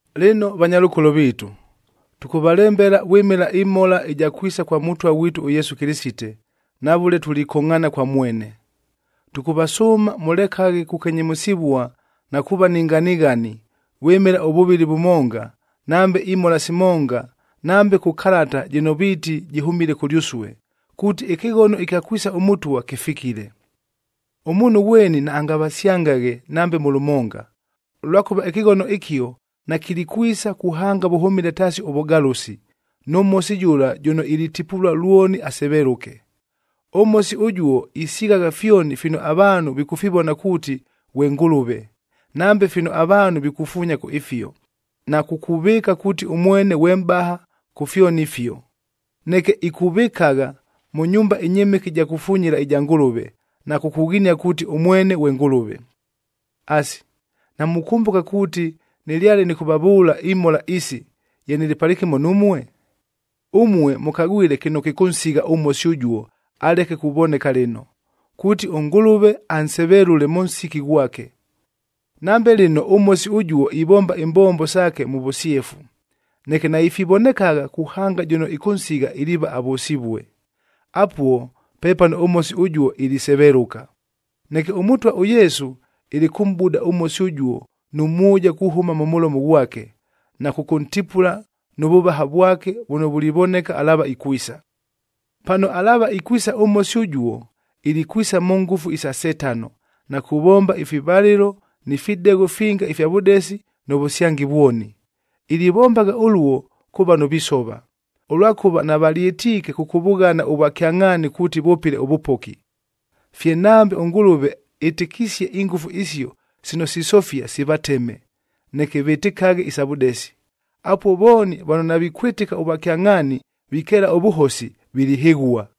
Lɨno vanyalʉkolo viitu, tʉkʉvalembela vwɨmɨla ɨmhola ɨja kwisa kwa Mʉtwa ghwitu ʉYesu Kɨlɨsite, na vʉle tulikongʼhaana kwa mwene. Tʉkʉvasʉʉma, mʉlekaghe kukenyemʉsɨvua na kuuva ni nganighani, vwɨmɨla ʉvʉvɨli vʉmonga, nambe imhola simonga, nambe kʉ kalata jɨno viiti jɨhʉmile kʉlyʉsue, kuuti ɨkɨghono ɨkya kwisa ʉMʉtwa kɨfikile. Ʉmuunhu ghweni naangavasyangaghe nambe mʉ lʉmonga, ʉlwakʉva ɨkɨghono ɨkio nakilikwisa kuhanga vʉhʉmile taasi ʉvʉgalʉsi, nʉ Mhosi jʉla jʉno ilitipulua lwoni asevelʉke. ɄMhosi ʉjuo isighagha fyoni fino avaanhu vikʉfivona kuuti ghwe ngʉlʉve, nambe fino avaanhu vikufuunya kʉ ifio, na kukuvɨɨka kuuti ʉmwene ghwe mʼbaha kʉ fyoni ifio. Neke ikuvɨkagha mʉ nyumba ɨnyɨmɨke ɨja kufunyila ɨja Ngʉlʉve, na kukughinia kuuti ʉmwene ghwe Ngʉlʉve. Asi, namukʉmbʉka kuuti nɨlyale nɨkʉvavʉʉla imhola isi, ye nɨlɨ palɨkɨmo numue? Ʉmue mʉkagwile kɨno kɨkʉnsigha ʉMhosi ʉjuo, aleke kuvoneka lɨno, kuuti ʉNgʉlʉve ansevelʉle mʉ nsiki ghwake. Nambe lɨno ʉMhosi ʉjuo ivomba imbombo saake mʉ vʉsyefu, neke naifivonekagha kuhanga jʉno ɨkʉnsigha iliiva avʉsivue. Apuo pepano ʉMhosi ʉjuo ilisevelʉka. Neke ʉMʉtwa ʉYesu ilikʉmʼbuda ʉMhosi ʉjuo nʉ mwʉja kuhʉma mʉ mʉlomo ghwake, na kʉkʉntipula nʉ vʉvaha vwake vʉno vulivoneka alaava ikwisa. Pano alaava ikwisa ʉMhosi ʉjuo, ilikwisa mʉ ngʉfu isa Setano, na kuvomba ifivalɨlo ni fidegho finga ifya vʉdesi, nʉ vʉsyangi vwoni. Ilivombagha ʉluo kʉ vano visova, ʉlwakʉva navalyɨtiike kʉkʉvʉghana ʉvwakyangʼhaani kuuti vʉpɨle ʉvʉpoki. Fye nambe ʉNgʉlʉve ɨtɨkisie ingʉfu isio sino sisofia sivateme, neke vɨtɨkaghe isa vʉdesi. Apuo vooni vano navikwɨtɨka ʉvwakyangʼhaani, vikeela ʉvʉhosi, vilihɨghua.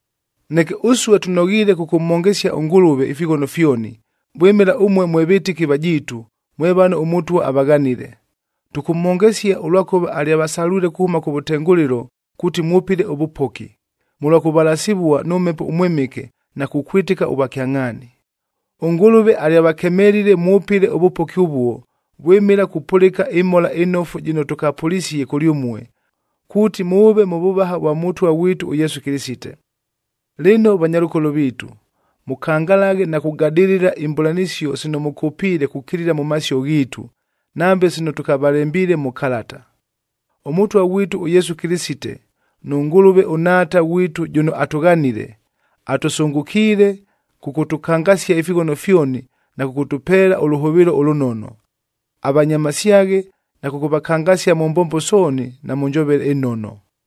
Neke ʉsue tʉnoghiile kʉkʉmhongesia ʉNgʉlʉve ifighono fyoni, vwɨmɨla ʉmue mwe vɨtɨki vajiitu, mwe vano ʉMʉtwa avaghanile. Tʉkʉmhongesia, ʉlwakʉva alyavasalwile kuhʉma kʉvʉtengʉlɨlo kuuti mwʉpɨle ʉvʉpoki, mʉlwa kʉvalasivua nʉ Mhepo ʉMwɨmɨke na kukwɨtɨka ʉvwakyangʼhaani. ɄNgʉlʉve alyavakemelile mwʉpɨle ʉvʉpoki ʉvuo, vwɨmɨla kupʉlɨka ɨMhola ɨNofu jɨno tʉkapʉlisie kʉlyʉmue, kuuti mʉʉve mʉ vʉvaha ʉvwa Mʉtwa ghwitu ʉYesu Kɨlɨsite. Lɨno vanyalʉkolo viitu, mʉkangalaghe na kugadɨlɨla imbʉlanɨsio sino mʉkʉpiile kukilila mʉ masio ghiitu, nambe sino tʉkavalembiile mʉ kalata. ɄMʉtwa ghwitu ʉYesu Kɨlɨsite nʉ Ngʉlʉve ʉNhaata ghwitu jʉno atʉghanile, atʉsʉngʉkiile kʉkʉtʉkangasia ifighono fyoni na kʉkʉtʉpeela ʉlʉhʉvɨɨlo ʉlʉnono. Avanyamasyaghe na kʉkʉvakangasia mʉ mbombo sooni na mʉ njovele ɨnono.